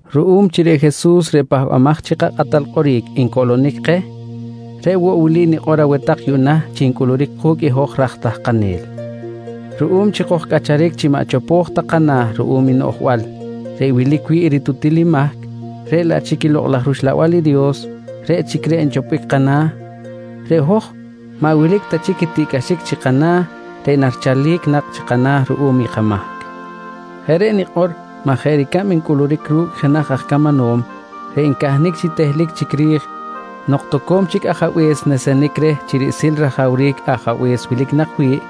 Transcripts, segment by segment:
Ruꞌum chi reꞌ Jesus reꞌ Pahbamaj chi kaKꞌatal Kꞌoric ncoꞌlonic keh, reꞌ woꞌ wili nikꞌor aweh tak yuꞌna chi ncꞌuluric ku̱cꞌ i hoj raj tahkanel: Ruꞌum chi kojcꞌacharic chi maꞌ chopo̱j ta kana̱ ruꞌum i noꞌjbal reꞌ wilic wi̱ꞌ i ritutil i mahc reꞌ laꞌ chic i Lokꞌ laj Uxlabal reꞌ chic reꞌ nchopbic kana̱, reꞌ hoj maꞌ wilic ta chic i tiꞌcꞌaxic chi kana̱ reꞌ narichalic nak chi kana̱ ruꞌum kamahc. Jeꞌ reꞌ nikꞌor maj jeꞌ ricab ncꞌuluric ru̱cꞌ jenaj aj camanom reꞌ ncahnic chi tehlic chic ri̱j nok toco̱m chic ajabe̱s nesenic reh chi riꞌsil rajawric ajabe̱s wilic nak wi̱ꞌ,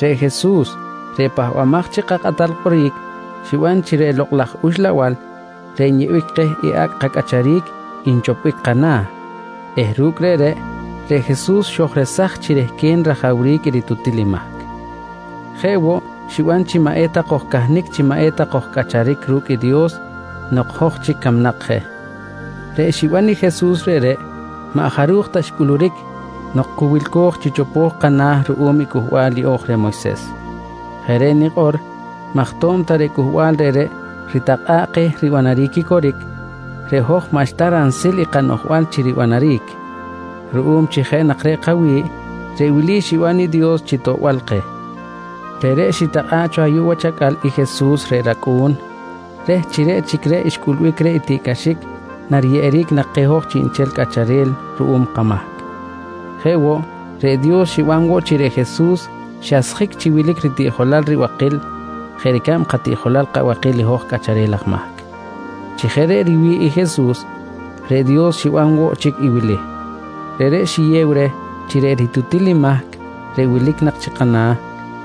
reꞌ Jesus reꞌ Pahbamaj chi kaKꞌatal Kꞌoric xiban chi reꞌ Lokꞌ laj Uxlabal reꞌ nyeꞌbic keh i acꞌ kacꞌacharic nchopbic kana̱ eh ru̱cꞌ reꞌreꞌ, reꞌ Jesus xojresaj chi rehquen rajawric i ritutil i mahc. Jeꞌ woꞌ xiban chi maꞌ eta kojcahnic chi maꞌ eta kojcꞌacharic ru̱cꞌ i Dios nok hoj chic camnak je. Reꞌ xiban i Jesus reꞌreꞌ maꞌ jaruj ta xcꞌuluric nok cu wilco̱j chi chopo̱j kana̱ ruꞌum i Cꞌuhbal Yeꞌo̱j reh Moyses. Jeꞌ reꞌ nikꞌor maj to̱b ta reꞌ cꞌuhbal reꞌreꞌ ritakꞌa̱ꞌ keh ribanaric i coric, reꞌ hoj maꞌxta ransil i kanoꞌjbal chi ribanaric. Ruꞌum chi jeꞌ nak reꞌ kawi̱ꞌ, reꞌ wili xiban i Dios chi toꞌbal keh: Reꞌreꞌ xitakꞌa̱ꞌ cho ayuꞌ wach acꞌal i Jesus reꞌ rAcꞌu̱n reh chi reꞌ chic reꞌ xcꞌulbic reh i tiꞌcꞌaxic nariyeꞌeric nak keh hoj chiꞌnchel cꞌacharel ruꞌum kamahc. Jeꞌ woꞌ, reꞌ Dios xiban woꞌ chi reꞌ Jesus xasjic chi wilic ritiꞌjolal ribakil jeꞌ ricab katiꞌjolal kabakil i hoj cꞌacharel aj mahc. Chi jeꞌ reꞌ riwi̱ꞌ i Jesus, reꞌ Dios xiban woꞌ chic i wili: Reꞌreꞌ xiyew reh chi reꞌ ritutil i mahc reꞌ wilic nak chi kana̱,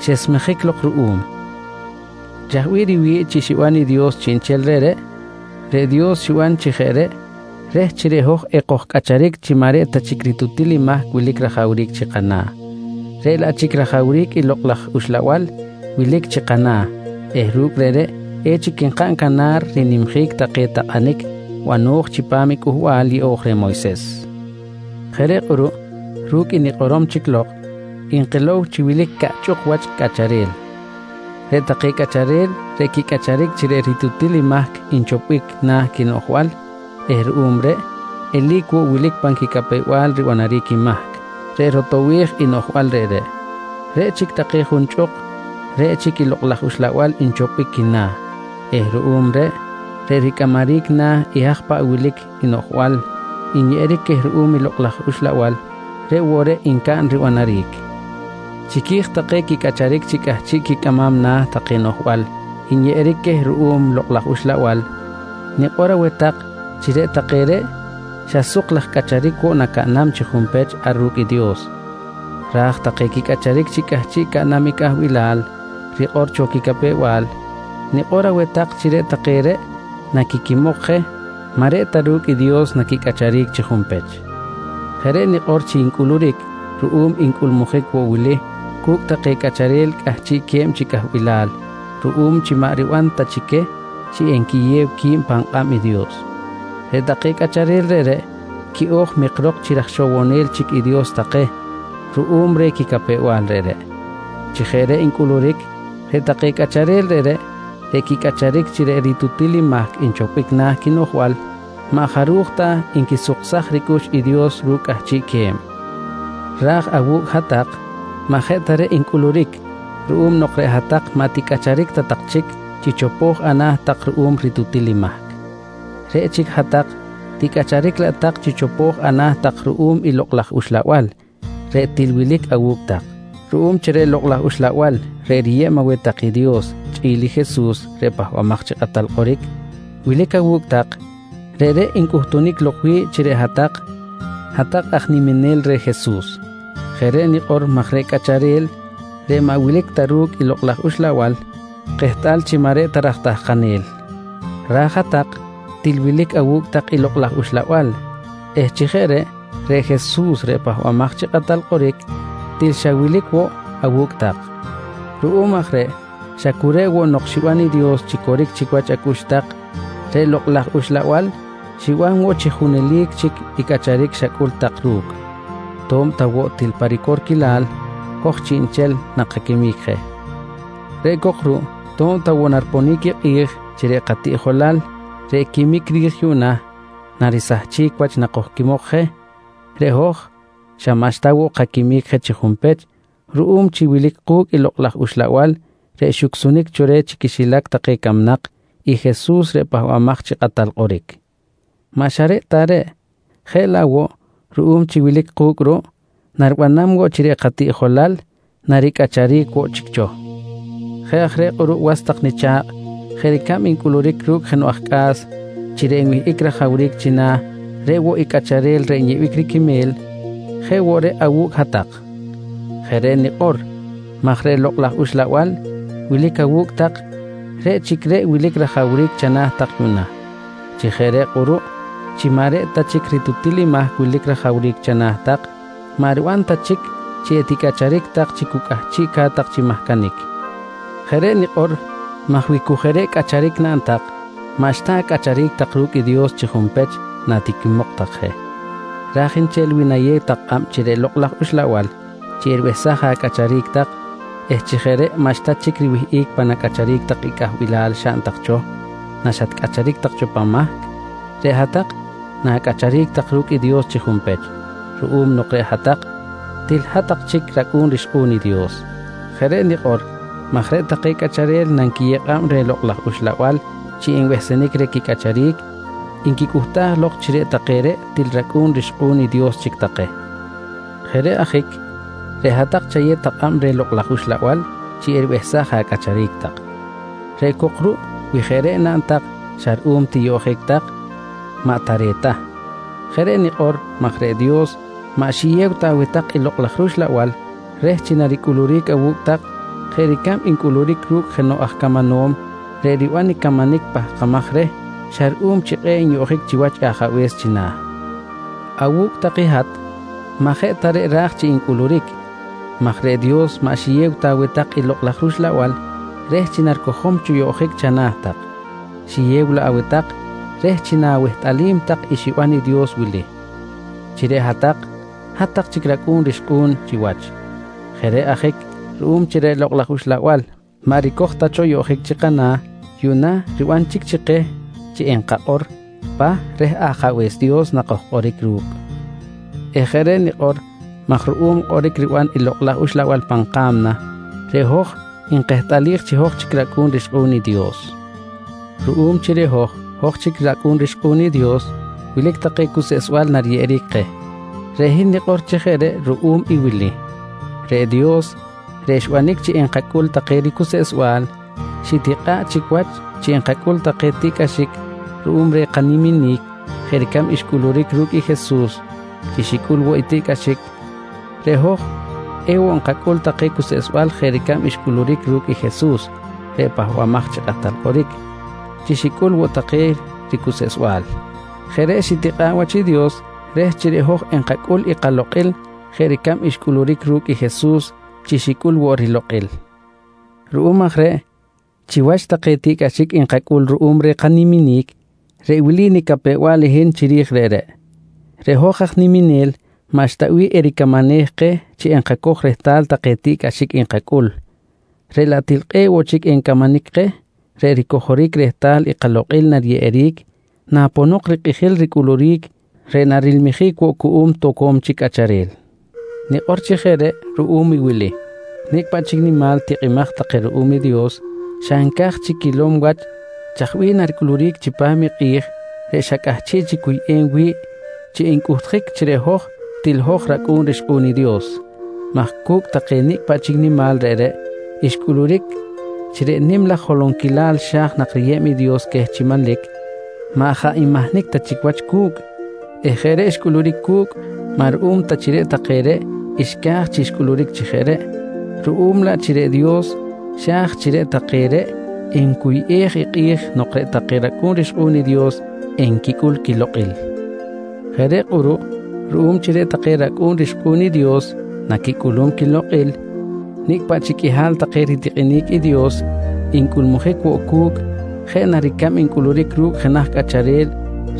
xesmejic lok ruꞌum. Chaj bih riwi̱ꞌ chi xiban i Dios chiꞌnchel reꞌreꞌ? Reꞌ Dios xiban chi jeꞌ reꞌ reh chi reꞌ hoj reꞌ ekojcꞌacharic chi maꞌ reꞌ ta chic ritutil i mahc wilic rajawric chi kana̱ reꞌ laꞌ chic rajawric i Lokꞌ laj Uxlabal wilic chi kana̱ eh ru̱cꞌ reꞌreꞌ echic nkaꞌn canar rinimjic take takꞌanic bano̱j chipam i Cꞌuhbal Yeꞌo̱j reh Moyses. Jeꞌ reꞌ kꞌuruꞌ ru̱cꞌ i nikꞌorom chic lok, nkilow chi wilic caꞌchꞌuk wach cꞌacharel: Reꞌ take cꞌacharel reꞌ quicꞌacharic chi reꞌ ritutil mahc nchopbic na̱ quinoꞌjbal eh ruꞌum reꞌ eli̱c woꞌ wilic pan quicapew-bal ribanaric i mahc reꞌ rotowej i noꞌjbal reꞌreꞌ. Reꞌ chic take junchꞌuk, reꞌ chic i Lokꞌ laj Uxlabal nchopbic quina̱ eh ruꞌum reꞌ, reꞌ ricꞌamaric na̱ i haj paꞌ wilic noꞌjbal nyeꞌeric queh ruꞌum i Lokꞌ laj Uxlabal reꞌ woꞌ reꞌ ncaꞌn ribanaric. Chiqui̱j take quicꞌacharic chi cꞌahchiꞌ quicꞌamam na̱ take noꞌjbal nyeꞌeric queh ruꞌum i Lokꞌ laj Uxlabal, nikꞌor aweh tak chi reꞌ take reꞌ xa suk laj cꞌacharic woꞌ nacaꞌnam chi junpech ar ru̱cꞌ Dios ra̱j take quicꞌacharic chi cꞌahchiꞌ caꞌnam i cꞌahbilal rikꞌor cho i quicapew-bal, nikꞌor aweh tak chi reꞌ take reꞌ naquiquimok je maꞌ reꞌ ta ru̱cꞌ i Dios naquicꞌacharic chi junpech. Jeꞌ reꞌ nikꞌor chi ncꞌuluric ruꞌum ncꞌulmujic woꞌ wili cu̱cꞌ take cꞌacharel cꞌahchiꞌque̱b chi cꞌahbilal ruꞌum chi maꞌ riban ta chi queh chi nquiyew qui̱b pan kꞌab i Dios: Reꞌ take cꞌacharel reꞌreꞌ quiꞌo̱j mikrok chi ra̱j ixowonel chic i Dios take ruꞌum reh quicapew-bal reꞌreꞌ. Chi jeꞌ reꞌ ncꞌuluric reꞌ take cꞌacharel reꞌreꞌ, reꞌ quicꞌacharic chi reꞌ ritutil i mahc nchopbic na̱ quinoꞌjbal, maꞌ jaruj ta nquisuksaj ricꞌux i Dios ru̱cꞌ cꞌahchiꞌque̱b. Ra̱j awu̱cꞌ hat-tak maꞌ jeꞌ ta reꞌ ncꞌuluric ruꞌum nok reꞌ hat-tak maꞌ ticꞌacharic ta tak chic chi chopo̱j ana̱ tak ruꞌum ritutil i mahc. Reꞌ chic hat-tak ticꞌacharic laꞌ tak chi chopo̱j ana̱ tak ruꞌum i Lokꞌ laj Uxlabal reꞌ til wilic awu̱cꞌ tak. Ruꞌum chi reꞌ Lokꞌ laj Uxlabal reꞌ riyeb aweh tak i Dios chꞌi̱l i Jesus reꞌ Pahbamaj chi Kꞌatal Kꞌoric wilic awu̱cꞌ tak, reꞌreꞌ ncꞌuhtunic lok wi̱ꞌ chi reꞌ hat-tak, hat-tak aj niminel reh Jesus. Jeꞌ reꞌ nikꞌor maj reꞌ cꞌacharel reꞌ maꞌ wilic ta ru̱cꞌ i Lokꞌ laj Uxlabal kehtꞌal chi maꞌ reꞌ ta raj tahkanel. Raj i hat-tak til wilic awu̱cꞌ tak i Lokꞌ laj Uxlabal eh chi jeꞌ reꞌ, reꞌ Jesus reꞌ Pahbamaj chi Kꞌatal Kꞌoric, til xa wilic woꞌ awu̱cꞌ tak. Ruꞌum aj reꞌ xa cu reꞌ woꞌ nok xiban i Dios chi coric chic wach acꞌux tak, reꞌ Lokꞌ laj Uxlabal xiban woꞌ chi junelic chic i cꞌacharic xacꞌul tak ru̱cꞌ, to̱b ta woꞌ til pa ricorquilal hoj chiꞌnchel nakaquimic je. Reꞌ cok ruꞌ to̱b ta woꞌ nariponic i kꞌi̱j chi reꞌ katiꞌjolal reꞌ quimic ri̱j yuꞌna narisahchic wach nakojquimok je, reꞌ hoj xa maꞌxta woꞌ kaquimic je chi junpech ruꞌum chi wilic ku̱cꞌ i Lokꞌ laj Uxlabal reꞌ xucsunic cho reh chi quixilac take camnak i Jesus reꞌ Pahbamaj chi Kꞌatal Kꞌoric. Maꞌ xa reꞌ ta reꞌ, jeꞌ laꞌ woꞌ ruꞌum chi wilic ku̱cꞌ ruꞌ naribanam woꞌ chi reꞌ katiꞌjolal naricꞌacharic woꞌ chic cho. Jeꞌ aj reꞌ kꞌuruꞌ was tak nicha̱kꞌ, jeꞌ ricab ncꞌuluric ru̱cꞌ jenoꞌ aj cꞌa̱s chi reꞌ nwihꞌic rajawric china̱ reꞌ woꞌ i cꞌacharel reꞌ nyeꞌbic riquime̱l, jeꞌ woꞌ reꞌ awu̱cꞌ hat-tak. Jeꞌ reꞌ nikꞌor maj reꞌ Lokꞌ laj Uxlabal wilic awu̱cꞌ tak reꞌ chic reꞌ wilic rajawric chana̱ tak yuꞌna. Chi jeꞌ reꞌ kꞌuruꞌ chi maꞌ reꞌ ta chic i ritutil i mahc wilic rajawric chana̱ tak, maꞌ riban ta chic chi eticꞌacharic tak chi cu cꞌahchiꞌca̱t tak chi mahcanic. Jeꞌ reꞌ nikꞌor maj wi cu jeꞌ reꞌ cꞌacharic naꞌn tak, maꞌxta acꞌacharic tak ru̱cꞌ i Dios chi junpech natiquimok tak je. Ra̱j nchel wi nayew tak kꞌab reh Lokꞌ laj Uxlabal chi eribehsaj acꞌacharic tak eh chi jeꞌ reꞌ maꞌxta chic riwihꞌic pan acꞌacharic tak i cꞌahbilal xaꞌn tak cho naxatcꞌacharic tak cho pan mahc, reꞌ hat-tak na̱cꞌacharic tak ru̱cꞌ i Dios chi junpech ruꞌum nok reꞌ hat-tak til hat-tak chic racꞌu̱n rixkꞌu̱n i Dios. Jeꞌ reꞌ nikꞌor maj reꞌ take cꞌacharel nanquiyew kꞌab reh Lokꞌ laj Uxlabal chi enbehsenic reh quicꞌacharic, nquicꞌuhtaj lok chi reꞌ take reꞌ til racꞌu̱n rixkꞌu̱n i Dios chic take. Jeꞌ reꞌ ajic reꞌ hat-tak chayew tak kꞌab reh Lokꞌ laj Uxlabal chi eribehsaj acꞌacharic tak. Reꞌ cok ruꞌ wi jeꞌ reꞌ naꞌn tak xa ruꞌum chi tiyoꞌjic tak, maꞌ tare̱t ta. Jeꞌ reꞌ nikꞌor maj reꞌ Dios maꞌ xiyew ta aweh tak i Lokꞌ laj rUxlabal reh chi naricꞌuluric awu̱cꞌ tak jeꞌ ricab ncꞌuluric ru̱cꞌ i jenoꞌ aj camanom reꞌ riban i camanic pahkamaj reh xa ruꞌum chi kꞌe̱ꞌ nyoꞌjic chiwach ajabe̱s china̱. Awu̱cꞌ tak i hat maꞌ jeꞌ ta reꞌ ra̱j chi ncꞌuluric maj reꞌ Dios maꞌ xiyew ta aweh tak i Lokꞌ laj rUxlabal reh chi naricojom cho yoꞌjic chana̱ tak, xiyew laꞌ aweh tak reh chi na̱wehtꞌalim tak i xiban i Dios wili: Chi reꞌ hat-tak, hat-tak chic racꞌu̱n rixkꞌu̱n chiwach. Jeꞌ reꞌ ajic ruꞌum chi reꞌ Lokꞌ laj Uxlabal maꞌ ricoj ta cho yoꞌjic chi kana̱, yuꞌna riban chic chi keh chi enkakꞌor “Pah” reh Ajabe̱s Dios nakojkꞌoric ru̱cꞌ eh jeꞌ reꞌ nikꞌor maj ruꞌum kꞌoric riban i Lokꞌ laj Uxlabal pan ka̱mna, reꞌ hoj nkehtꞌalij chi hoj chic racꞌu̱n rixkꞌu̱n i Dios. Ruꞌum chi reꞌ hoj, hoj chic racꞌu̱n rixkꞌu̱n i Dios, wilic take cuseꞌsbal nariyeꞌeric keh. Reꞌ hin nikꞌor chi jeꞌ reꞌ ruꞌum i wili: Reꞌ Dios reꞌ xbanic chi enkacꞌul take ricuseꞌsbal xitikꞌa̱ꞌ chic wach chi nankacꞌul take tiꞌcꞌaxic ruꞌum reh kaniminic jeꞌ ricab xcꞌuluric ru̱cꞌ i Jesus chi xicꞌul woꞌ i tiꞌcꞌaxic, reꞌ hoj woꞌ enkacꞌul take kacuseꞌsbal jeꞌ ricab xcꞌuluric ru̱cꞌ Jesus reꞌ Pahbamaj chi Kꞌatal Kꞌoric chi xicꞌul woꞌ take ricuseꞌsbal. Jeꞌ reꞌ xitikꞌa̱ꞌ wach i Dios reh chi reꞌ hoj enkacꞌul i kalokꞌil jeꞌ ricab xcꞌuluric ru̱cꞌ i Jesus chi xicꞌul woꞌ rilokꞌil. Ruꞌum aj reꞌ chiwach take tiꞌcꞌaxic nkacꞌul ruꞌum reh kaniminic, reꞌ wili nicapew-bal i hin chiri̱j reꞌreꞌ: Reꞌ hoj aj niminel maꞌxta bih ericamanej keh chi enkacoj rehtal take tiꞌcꞌaxic nkacꞌul, reꞌ laꞌ til kꞌe̱ꞌ woꞌ chic encamanic keh reꞌ ricojoric rehtal i kalokꞌil nariyeꞌeric naponok rikꞌijil ricꞌuluric reꞌ narilmijic woꞌ cuꞌum toco̱m chic cꞌacharel. Nikꞌor chi jeꞌ reꞌ ruꞌum i wili: Nicꞌ paꞌ chic nimal tikꞌimaj take ruꞌum i Dios xa nca̱j chic quilom wach chaj bih naricꞌuluric chipam i kꞌi̱j reꞌ xa cꞌahchiꞌ chic cuyꞌem wi̱ꞌ chi ncꞌuhtjic chi reꞌ hoj til hoj racꞌu̱n rixkꞌu̱n i Dios maj cu̱cꞌ take nicꞌ paꞌ chic nimal reꞌreꞌ xcꞌuluric chi reꞌ nim laj holonquilal xa̱j nak riyeb i Dios queh chi manlic maꞌ jaꞌ nmahnic ta chic wach cu̱cꞌ eh jeꞌ reꞌ xcꞌuluric cu̱cꞌ maꞌ ruꞌum ta chi reꞌ take reꞌ xca̱j chi xcꞌuluric chi jeꞌ reꞌ, ruꞌum laꞌ chi reꞌ Dios xa̱j chi reꞌ take reꞌ encuyꞌej i kꞌi̱j nok reꞌ take racꞌu̱n rixkꞌu̱n i Dios enquicꞌul quilokꞌil. Jeꞌ reꞌ kꞌuruꞌ ruꞌum chi reꞌ take racꞌu̱n rixkꞌu̱n i Dios naquicꞌulum quilokꞌil, nicꞌ paꞌ chic qꞌuihal take ritikꞌinic i Dios ncꞌulmujic woꞌ cu̱cꞌ, jeꞌ na ricab ncꞌuluric ru̱cꞌ jenaj cꞌacharel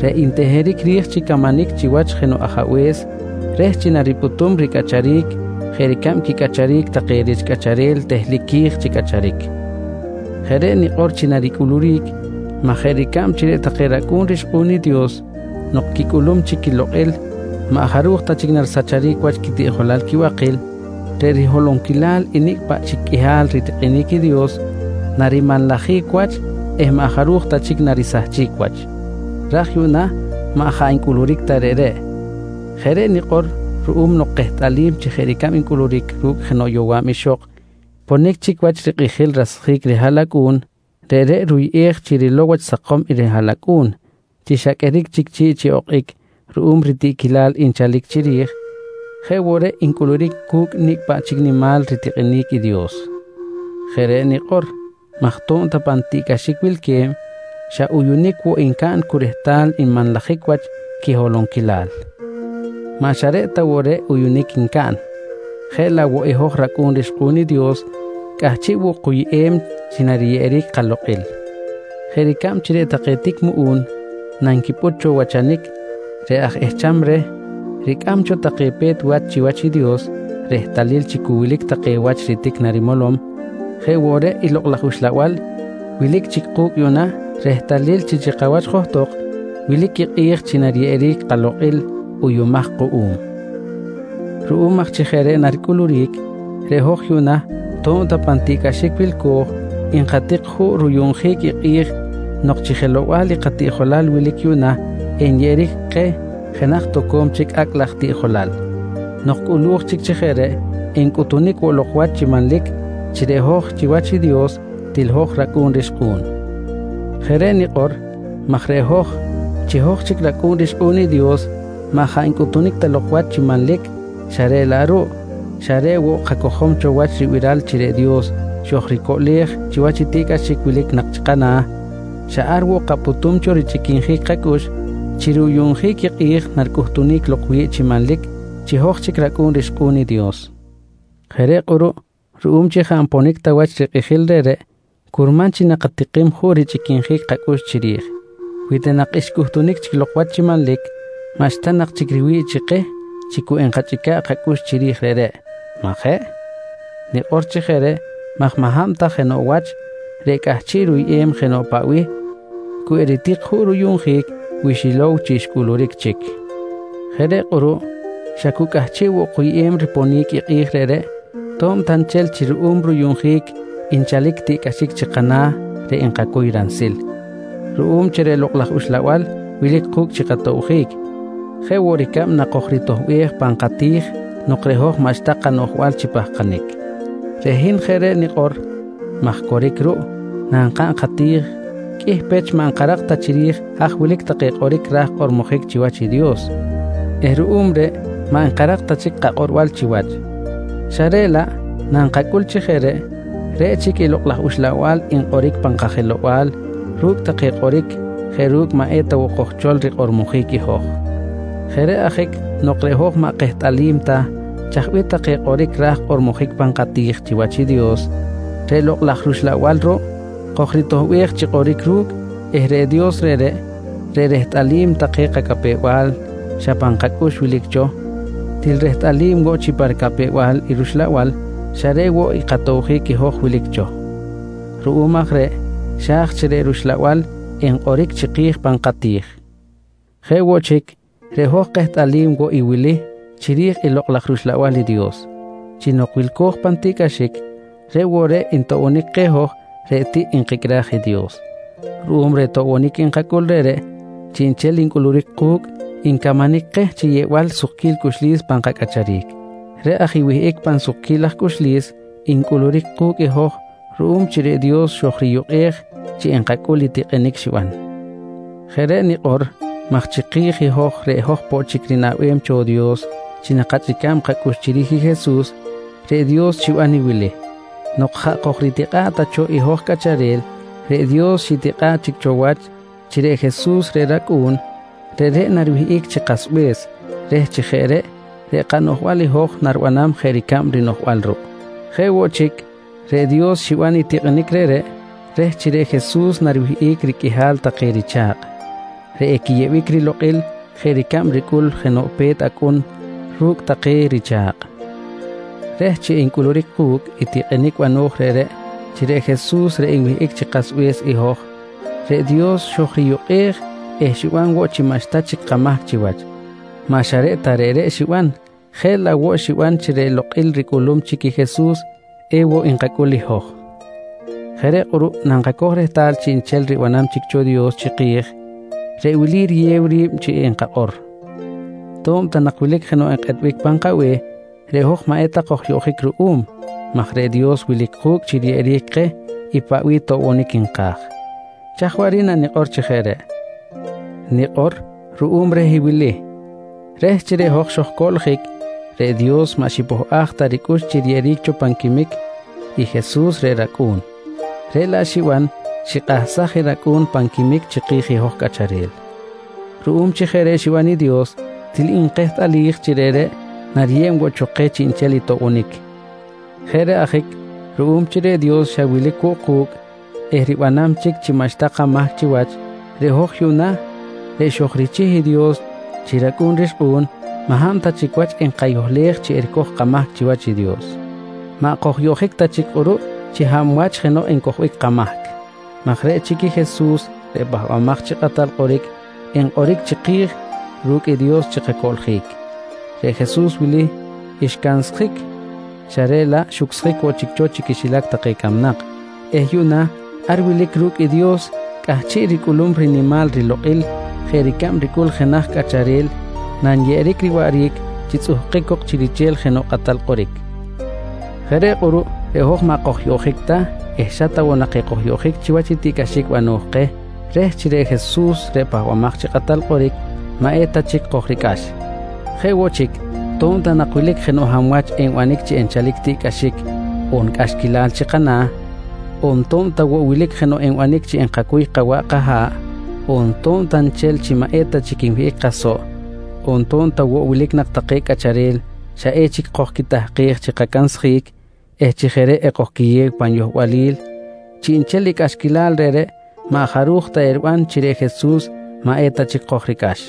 reꞌ nteheric ri̱j chi camanic chiwach jenoꞌ ajabe̱s reh chi naripꞌutum ricꞌacharic jeꞌ ricab quicꞌacharic take rich cꞌacharel tehlic qui̱j chi cꞌacharic. Jeꞌ reꞌ nikꞌor chi naricꞌuluric maj jeꞌ ricab chi reꞌ take racꞌu̱n rixkꞌu̱n i Dios nok quicꞌulum chic quilokꞌil maꞌ jaruj ta chic narisahchic wach quitiꞌjolal quibakil, reꞌ riholonquilal i nicꞌ paꞌ chic qꞌuihal ritikꞌinic i Dios narimanlajic wach eh maꞌ jaruj ta chic narisahchic wach. Raj yuꞌna maꞌ jaꞌ ncꞌuluric ta reꞌreꞌ. Jeꞌ reꞌ nikꞌor ruꞌum nok kehtꞌalim chi jeꞌ ricab ncꞌuluric ru̱cꞌ jenoꞌ yowa̱b ixok ponic chic wach rikꞌijil rasjic rihaꞌlacꞌu̱n reꞌreꞌ ruyꞌej chi rilow wach sakom i rihaꞌlacꞌu̱n chi xa qꞌueric chic chi̱ꞌ chi okꞌic ruꞌum ritiꞌquilal nchalic chiri̱j, jeꞌ woꞌ reꞌ ncꞌuluric cu̱cꞌ nicꞌ paꞌ chic nimal ritikꞌinic i Dios. Jeꞌ reꞌ nikꞌor maj to̱b ta pan tiꞌcꞌaxic wilque̱b, xa uyuꞌunic woꞌ ncaꞌn cu rehtal nmanlajic wach quiholonquilal. Maꞌ xa reꞌ ta woꞌ reꞌ uyunic ncaꞌn, jeꞌ laꞌ woꞌ i hoj racꞌu̱n rixkꞌu̱n i Dios cꞌahchiꞌ woꞌ kuyꞌem chi nariyeꞌeric i kalokꞌil. Jeꞌ ricab chi reꞌ take tic muꞌu̱n nanquipꞌut cho wachanic, reꞌ aj ehcham reh ricꞌam cho take pe̱t wach chiwach i Dios rehtalil chi cu wilic take wach ritic narimolom, jeꞌ woꞌ reꞌ i Lokꞌ laj Uxlabal wilic chic ku̱cꞌ yuꞌna rehtalil chi chikawach johtok wilic i kꞌi̱j chi nariyeꞌeric i kalokꞌil uyuꞌumaj kuꞌum. Ruꞌum aj chi jeꞌ reꞌ naricꞌuluric, reꞌ hoj yuꞌna to̱b ta pan tiꞌcꞌaxic wilco̱j, nkatik juꞌ ruyuꞌnjic i kꞌi̱j nok chi jelow-bal i katiꞌjolal wilic yuꞌna enyeꞌeric keh jenaj toco̱m chic acꞌ laj tiꞌjolal. Nok cꞌulu̱j chic chi jeꞌ reꞌ, encꞌutunic woꞌ lok wach chi manlic chi reꞌ hoj chiwach i Dios til hoj racꞌu̱n rixkꞌu̱n. Jeꞌ reꞌ nikꞌor maj reꞌ hoj, chi hoj chic racꞌu̱n rixkꞌu̱n i Dios maꞌ jaꞌ ncꞌutunic ta lok wach chi manlic xa reꞌ laꞌ ruꞌ xa reꞌ woꞌ kacojom cho wach i ribiral chi reꞌ Dios xojricoꞌlej chiwach i tiꞌcꞌaxic wilic nak chi kana̱, xa ar woꞌ kapꞌutum cho richꞌiquinjic kacꞌux chi ruyuꞌnjic i kꞌi̱j naricꞌuhtunic lok wi̱ꞌ chi manlic chi hoj chic racꞌu̱n rixkꞌu̱n i Dios. Jeꞌ reꞌ kꞌuruꞌ ruꞌum chi jaꞌ nponic ta wach rikꞌijil reꞌreꞌ, curman chi nakatikim juꞌ richꞌiquinjic kacꞌux chiri̱j. Wi ta nak xcꞌuhtunic chic lok wach chi manlic, maꞌxta nak chic riwi̱ꞌ chi keh chi cu enkachꞌica̱ꞌ kacꞌux chiri̱j reꞌreꞌ, majeꞌ? Nikꞌor chi jeꞌ reꞌ maj maꞌ hab ta jenoꞌ wach reꞌ cꞌahchiꞌ ruyꞌem jenoꞌ paꞌ bih, cu eritik juꞌ ruyuꞌnjic wi xilow chi xcꞌuluric chic. Jeꞌ reꞌ kꞌuruꞌ xa cu cꞌahchiꞌ woꞌ kuyꞌem riponic i kꞌi̱j reꞌreꞌ, to̱b ta nchel chi ruꞌum ruyuꞌnjic nchalic tiꞌcꞌaxic chi kana̱ reꞌ nkacuy ransil ruꞌum chi reꞌ Lokꞌ laj Uxlabal wilic ku̱cꞌ chi katobjic, jeꞌ woꞌ ricab nakojritoꞌbej pan kati̱j nok reꞌ hoj maꞌxta kanoꞌjbal chi pahkanic. Reꞌ hin jeꞌ reꞌ nikꞌor maj coric ruꞌ, nankaꞌn kati̱j qꞌuih pech maꞌ nkarak ta chiri̱j haj wilic take kꞌoric ra̱j kꞌormojic chiwach i Dios eh ruꞌum reꞌ maꞌ nkarak ta chic kakꞌorbal chiwach. Xa reꞌ laꞌ nankacꞌul chi jeꞌ reꞌ, reꞌ chic i Lokꞌ laj Uxlabal nkꞌoric pan kajelow-bal ru̱cꞌ take kꞌoric jeꞌ ru̱cꞌ maꞌ eta woꞌ kojchol rikꞌormojic i hoj. Jeꞌ reꞌ ajic nok reꞌ hoj maꞌ kehtꞌalim ta chaj bih take kꞌoric ra̱j kꞌormojic pan kati̱j chiwach i Dios, reꞌ Lokꞌ laj rUxlabal ruꞌ kojritoꞌbej chi kꞌoric ru̱cꞌ eh reꞌ Dios reꞌreꞌ, reꞌ rehtꞌalim take capew-bal xa pan kacꞌux wilic cho, til rehtꞌalim woꞌ chi pa ricapew-bal i rUxlabal xa reꞌ woꞌ katobjic i hoj wilic cho. Ruꞌum aj reꞌ xa̱j chi reꞌ rUxlabal enkꞌoric chiki̱j pan kati̱j. Jeꞌ woꞌ chic, reꞌ hoj kehtꞌalim woꞌ i wili chiri̱j i Lokꞌ laj rUxlabal i Dios: Chi nok wilco̱j pan tiꞌcꞌaxic reꞌ woꞌ reꞌ ntoꞌbonic keh hoj reꞌ tiꞌ nkicꞌraj i Dios. Ruꞌum reh toꞌbonic nkacꞌul reꞌreꞌ, chiꞌnchel ncꞌuluric ku̱cꞌ ncamanic keh chi yeꞌbal sukquil cꞌuxlis pan kacꞌacharic. Reꞌ aj i wihꞌic pan sukquil laj cꞌuxlis ncꞌuluric ku̱cꞌ i hoj ruꞌum chi reꞌ Dios xojriyukꞌej chi enkacꞌul i tikꞌinic xiban. Jeꞌ reꞌ nikꞌor maj chiki̱j i hoj reꞌ hoj poꞌ chic rinaꞌbem cho Dios chi nakachꞌica̱b kacꞌux chiri̱j i Jesus, reꞌ Dios xiban i wili: Nok jaꞌ kojritikꞌa̱ꞌ ta cho i hoj cꞌacharel, reꞌ Dios xitikꞌa̱ꞌ chic cho wach chi reꞌ Jesus reꞌ rAcꞌu̱n, reꞌreꞌ nariwihꞌic chi kasbe̱s reh chi jeꞌ reꞌ, reꞌ kanoꞌjbal i hoj naribanam jeꞌ ricab i rinoꞌjbal ruꞌ. Jeꞌ woꞌ chic, reꞌ Dios xiban i tikꞌinic reꞌreꞌ reh chi reꞌ Jesus nariwihꞌic riqꞌuihal take richa̱kꞌ reꞌ equiyeꞌbic rilokꞌil jeꞌ ricab ricꞌul jenoꞌ pe̱t acꞌun ru̱cꞌ take richa̱kꞌ. Reh chi encꞌuluric ku̱cꞌ i tikꞌinic bano̱j reꞌreꞌ chi reꞌ Jesus reꞌ enwihꞌic chi kasbe̱s i hoj, reꞌ Dios xojriyukꞌej eh xiban woꞌ chi maꞌxta chic kamahc chiwach. Maꞌ xa reꞌ ta reꞌreꞌ xiban, jeꞌ laꞌ woꞌ xiban chi reꞌ lokꞌil ricꞌulum chic i Jesus ewoꞌ nkacꞌul i hoj. Jeꞌ reꞌ kꞌuruꞌ nankacoj rehtal chiꞌnchel i ribanam chic cho i Dios chiki̱j, reꞌ wili riyew ri̱b chi enkakꞌor: To̱b ta nak wilic jenoꞌ nkꞌetbic pan kabe̱h, reꞌ hoj maꞌ eta kojyoꞌjic ruꞌum maj reꞌ Dios wilic ku̱cꞌ chi riyeꞌeric keh i paꞌ bih toꞌbonic nka̱j. Chaj waꞌric nanikꞌor i reꞌreꞌ? Nikꞌor ruꞌum reh i wili: Reh chi reꞌ hoj xojcoꞌljic, reꞌ Dios maꞌ xipohꞌaj ta ricꞌux chi riyeꞌeric cho pan quimic i Jesus reꞌ rAcꞌu̱n, reꞌ laꞌ xiban xikꞌahsaj i rAcꞌu̱n pan quimic chiki̱j i hoj cꞌacharel. Ruꞌum chi jeꞌ reꞌ xiban i Dios til nkehtꞌalij chi reꞌreꞌ nariyeb woꞌ cho keh chiꞌnchel i toꞌbonic. Jeꞌ reꞌ ajic ruꞌum chi reꞌ Dios xa wilic woꞌ ku̱cꞌ eh ribanam chic chi maꞌxta kamahc chiwach, reꞌ hoj yuꞌna reꞌ xojrichih i Dios chi racꞌu̱n rixkꞌu̱n maꞌ hab ta chic wach enkayohlej chi ericoj kamahc chiwach i Dios. Maꞌ kojyoꞌjic ta chic kꞌuruꞌ chi hab wach jenoꞌ encojbic kamahc maj reꞌ chic i Jesus reꞌ Pahbamaj chi Kꞌatal Kꞌoric enkꞌoric chiki̱j ru̱cꞌ i Dios chi kacoꞌljic. Reꞌ Jesus wili xcansjic je xa reꞌ laꞌ xucsjic woꞌ chic cho chi quixilac take camnak eh yuꞌna ar wilic ru̱cꞌ i Dios cꞌahchiꞌ ricꞌulum rinimal rilokꞌil jeꞌ ricab ricꞌul jenaj cꞌacharel nanyeꞌeric riwaꞌric chi tzꞌuhkic cok chi riche̱l jenoꞌ kꞌatal kꞌoric. Jeꞌ reꞌ kꞌuruꞌ reꞌ hoj maꞌ kojyoꞌjic ta eh xa ta woꞌ nak ekojyoꞌjic chiwach i tiꞌcꞌaxic bano̱j keh reh chi reꞌ Jesus reꞌ Pahbamaj chi Kꞌatal Kꞌoric maꞌ eta chic kojricꞌax. Jeꞌ woꞌ chic to̱b ta nak wilic jenoꞌ hab wach enbanic chi enchal tiꞌcꞌaxic on cꞌaxquilal chi kana̱, on to̱b ta woꞌ wilic jenoꞌ enbanic chi enkacuy kawaꞌ kaha̱ꞌ, on to̱b ta nchel chi maꞌ eta chic nwihꞌic kasoꞌ, on to̱b ta woꞌ wilic nak take cꞌacharel xa echic kojquitahkej chi kacansjic eh chi jeꞌ reꞌ ekojquiyew pan yohbalil, chiꞌnchel i cꞌaxquilal reꞌreꞌ maꞌ jaruj ta eriban chi reꞌ Jesus maꞌ eta chic kojricꞌax.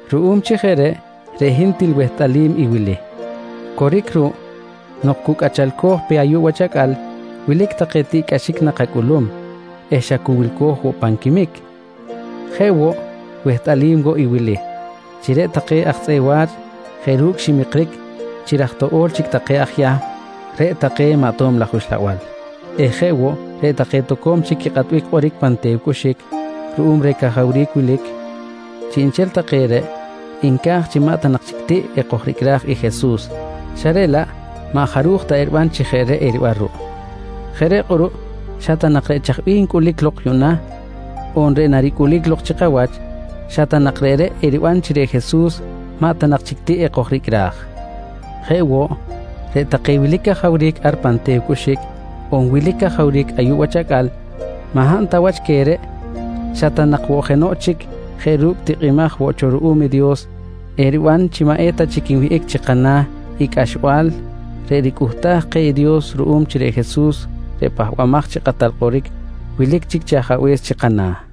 Ruꞌum chi jeꞌ reꞌ, reꞌ hin til wehtꞌalim i wili: Coric ruꞌ nok cu cꞌachalco̱j pe ayuꞌ wach acꞌal, wilic take tiꞌcꞌaxic nakacꞌulum eh xa cu wilco̱j woꞌ pan quimic. Jeꞌ woꞌ, wehtꞌalim woꞌ i wili: Chi reꞌ take aj tzꞌeꞌ wa̱ch jeꞌ ru̱cꞌ ximikric chi raj toꞌo̱l chic take i aj Yahm, reꞌ take maꞌ ato̱b laj uxlabal eh jeꞌ woꞌ reꞌ take toco̱m chic quikꞌatbic kꞌoric pan te̱w cꞌuxic ruꞌum reh cajawric wilic, chiꞌnchel take reꞌ nca̱j nak chi maꞌ ta nak chic tiꞌ ekojricꞌra̱j i Jesus xa reꞌ laꞌ maꞌ jaruj ta eriban chi jeꞌ reꞌ eriban ruꞌ. Jeꞌ reꞌ kꞌuruꞌ xa ta nak reꞌ chaj bih ncꞌuluric lok yuꞌna, on reꞌ naricꞌuluric lok chi kawach, xa ta nak reꞌreꞌ eriban chi reꞌ Jesus maꞌ ta nak chic tiꞌ ekojricꞌra̱j. Jeꞌ woꞌ, reꞌ take wilic cajawric ar pan te̱w cꞌuxic, on wilic cajawric ayuꞌ wach acꞌal, maꞌ hab ta wach queh reꞌ xa ta nak woꞌ jenoꞌ chic jeꞌ ru̱cꞌ tikꞌimaj woꞌ cho ruꞌum i Dios, eriban chi maꞌ eta chic nwihꞌic chi kana̱ i cꞌaxbal reꞌ ricꞌuhtaj keh i Dios ruꞌum chi reꞌ Jesus reꞌ Pahbamaj chi Kꞌatal Kꞌoric wilic chic chi Ajabe̱s chi kana̱.